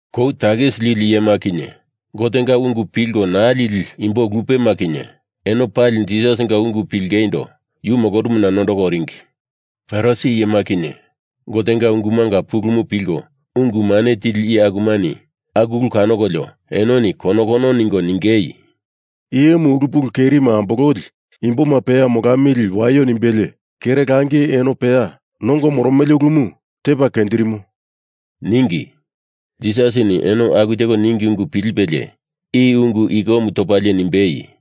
Kou takisi lili iyema kinye Gotenga ungu pilko naa lili imbo lupema kinye eno pali Jisasinga ungu pilingeindo yu molorumuna nondoko oringi. Farisi iyema kinye Gotenga ungumanga pulumu pilko ungu mane tili iye akumani aku ulu kanokolio enoni konokono ningo ningei, “I iyemu ulu pulu kerima ambololi imboma peya molamili waio nimbelie, kere langi eno peya nongo moromele ulumu tepa kenjirimo,” ningi. Jisasini eno aku teko ningi ungu pilipelie i ungu ikomu topalie nimbei,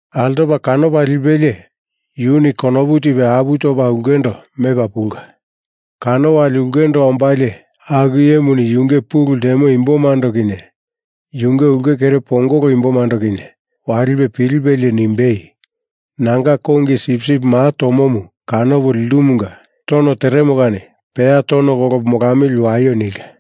Altopa kanopa lipelie yuni konopu tipe apu topa ulkendo mepa pulka. Kano wali ulkendo ombalie aku iyemuni yunge pulu ltemo imbomando kinye yunge ulke kere pongolo imbomando kinye walipe pilipelie nimbei, ‘Nanga kongi sipsip maa tomomu kanopo lindumunga tono teremo kani peya tono kolopo molamili waio,’ nilka.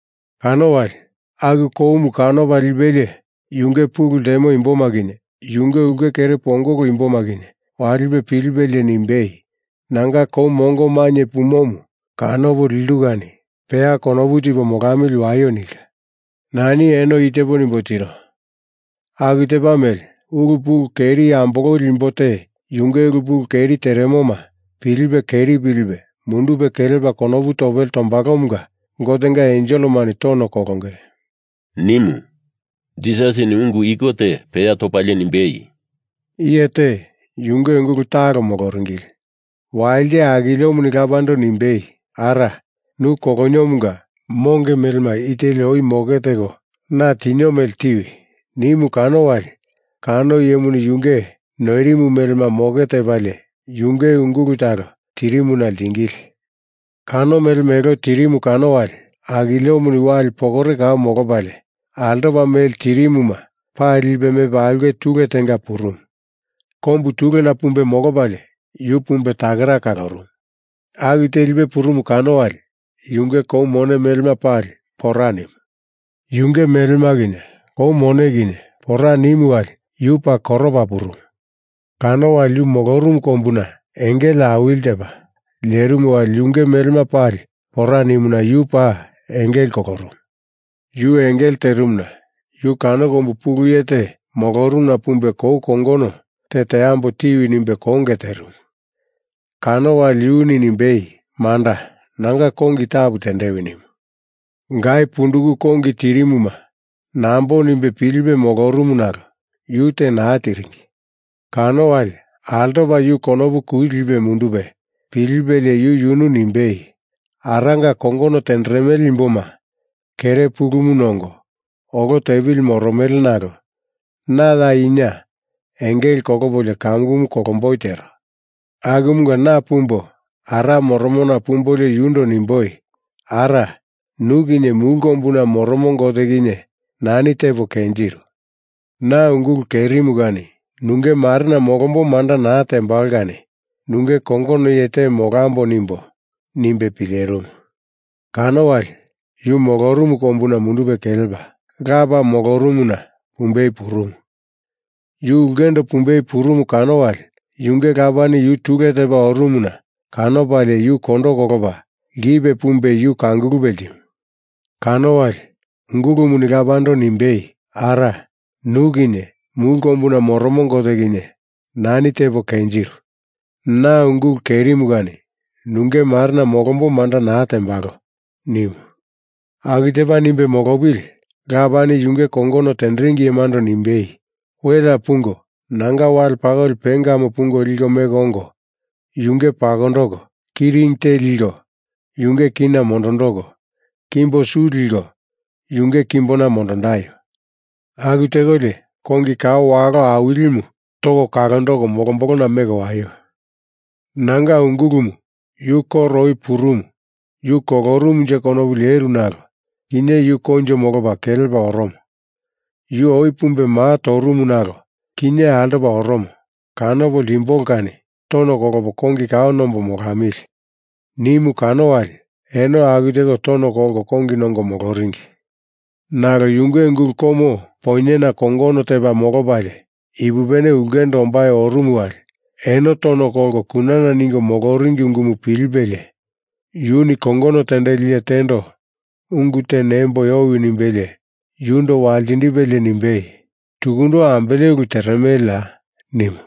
Kano wali, aku koumu kanopa lipelie yunge pulu ltemo imboma kinye yunge ulke kere pongolo imboma kinye walipe pilipilie nimbei, ‘Nanga kou mongo mainye pumomu kanopo lindu kani peya konopu tipo molamili waio,’ nilka. Nani eno i tepo nimbo tiro. Aku tepa mele ulu pulu keri ambololi imbo te yunge ulu pulu keri teremoma pilipe keri pilipe mundupe kelepa konopu topele tombalomunga Gotenga enselemani tono kolonge,” nimu. Jisasini ungu iko te peya topalie nimbei, “Iye te, yunge ungulu talo moloringili. Walite akiliomuni lapando nimbei, ‘Ara, nu koloniomunga monge melema i teli oi moke teko na tinio mele tiwi!’ nimu kano wali kano iyemuni yunge noirimu melema moke tepalie yunge ungulu talo tirimuna ltingili. Kano melema elo tirimu kano wali akiliomu wali pokore kau molopalie, altopa mele tirimuma pali lipe mepa aulke tule tenga purumu. Kombu tulena pumbe molopalie yu pumbe takera kalorumu. Aku telipe purumu kano wali yunge kou mone melema pali pora nimu. Yunge melema kinye kou mone kinye pora nimu wali yu paa koropa purumu. Kano wali yu molorumu kombuna engele awili tepa lerimu wali yunge melema pali pora nimuna yu paa engele kolorumu. Yu engele terimuna yu kano kombu pulu iye te molorumuna pumbe kou kongono te teambo tiwi nimbe konge terimu kano wali yuni nimbei, ‘Manda, nanga kongi tapu tendewi,’ nimu. Gai punduku kongi tirimuma nambo nimbe pilipe molorumu nalo yu te naa tiringi. Kano wali, altopa yu konopu kuli lipe mundupe pilipelie yu yunu nimbei, ‘Aranga kongono tenderemele imboma kere pulumu nongo olo tepili moromele nalo na ya ina engele kolopolio kamukumu kolomboi tero. Akumunga na pumbo Ara moromona pumbolio yundo nimboi, “Ara, nu kinye Mulu Kombuna Moromo Gote kinye nani tepo kenjiru. Na ungulu kerimu kani nunge marena molombo manda naa tembalo kani nunge kongono iye te molambo,” nimbo,’ nimbe pilerimu. Kano wali, yu molorumu kombuna mundupe kelepa, lapa molorumuna pumbei purumu. Yu ulkendo pumbei purumu kano wali yunge lapani yu tule tepa orumuna kanopalie yu kondo kolopa lkipe pumbe yu kangulupe ltimu. Kano wali ungulumuni lapando nimbei, ‘Ara, nu kinye Mulu Kombuna Moromo Gote kinye nani tepo kenjiru. Na ungulu kerimu kani nunge marena molombo manda naa tembalo!’ nimu. Aku tepa nimbe molopili lapani yunge kongono tenderingi iyemando nimbei, ‘Welea pungo nanga wale pakoli pengamu pungo liko meko ongo yunge pakondoko, ki ring te liko yunge kina mondondoko, kimbo su liko yunge kimbona mondondaio! Aku tekolio kongi kao walo awilimu toko kalondoko molombolona meko waio! Nanga ungulumu yu koro oi purumu yu kolorumunje konopu leru nalo kinye yu koinjo molopa kelepa oromo. Yu oi pumbe maa torumu nalo kinye altopa oromo kanopo ltimbolo kani tono kolopo kongi kao nombo molamili,’ nimu kano wali eno aku teko tono kolko kongi nongo moloringi. Nalo yunge ungulu komo poinyena kongono tepa molopalie ipupene ulkendo ombai orumu wali eno tono kolko kunana ningo moloringi ungumu pilipelie yuni kongono tendeli iye tendo ungu te nemboi owi nimbelie, yundo waltindipelie nimbei, ‘Tukundo ambele ulu teremeleya?’ nimu.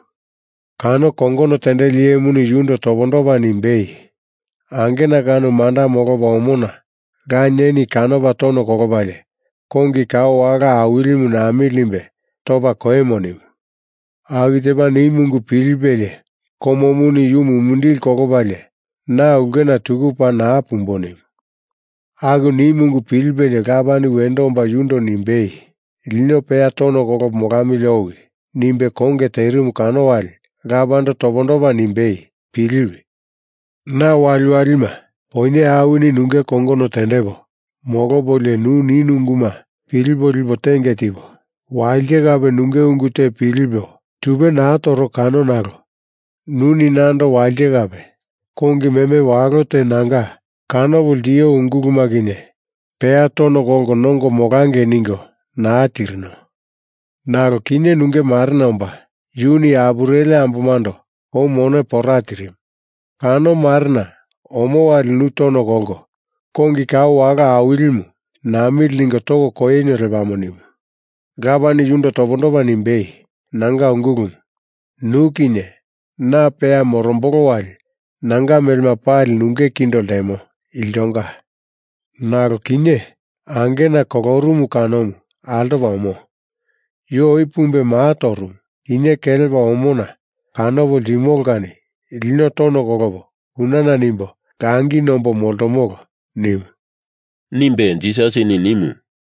Kano kongono tendeli iyemuni yundo topondopa nimbei, ‘Angena kano manda molopa omona lanieni kanopa tono kolopalie kongi kao walo awilimu namili nimbe topa koimo,’ nimu. Aku tepa nimu ungu pilipelie komomu yu mumindili kolopalie na ulkena tuku paa naa pumbo nimu. Aku nimu ungu pilipelie lapani wendo omba yundo nimbei, ‘Lino peya tono kolopo molamili owi,’ nimbe konge terimu kano wali lapando topondopa nimbei, ‘Piliwi. Na waliwalima, poinye awini nunge kongono tendepo molopolio nu nino unguma pilipe lipo tenge tipo, walite kape nunge ungu te pilipo tupe naa toro kano nalo nuni nando walite kape kongi meme walo te nanga kanopo ltio unguluma kinye peya tono kolko nongo molangei ningo naa tirino. Nalo kinye nunge marena omba, yuni apureli ambomando kou mone pora tirimu, kano marena omo wali nu tono kolko kongi kao walo awilimu namili ningo toko koinio lepamo,’ nimu. Lapani yundo topondopa nimbei, ‘Nanga ungulumu, nu kinye na peya morombolo wali nanga melema pali nunge kindo ltemo, iltonga. Nalo kinye angena kolorumu kanomu altopa omo. Yu oi pumbe maa torumu, kinye kelepa omona kanopo ltimolo kani lino tono kolopo kunana nimbo langi nombo moltomolo,’ nimu,” nimbe Jisasini nimu.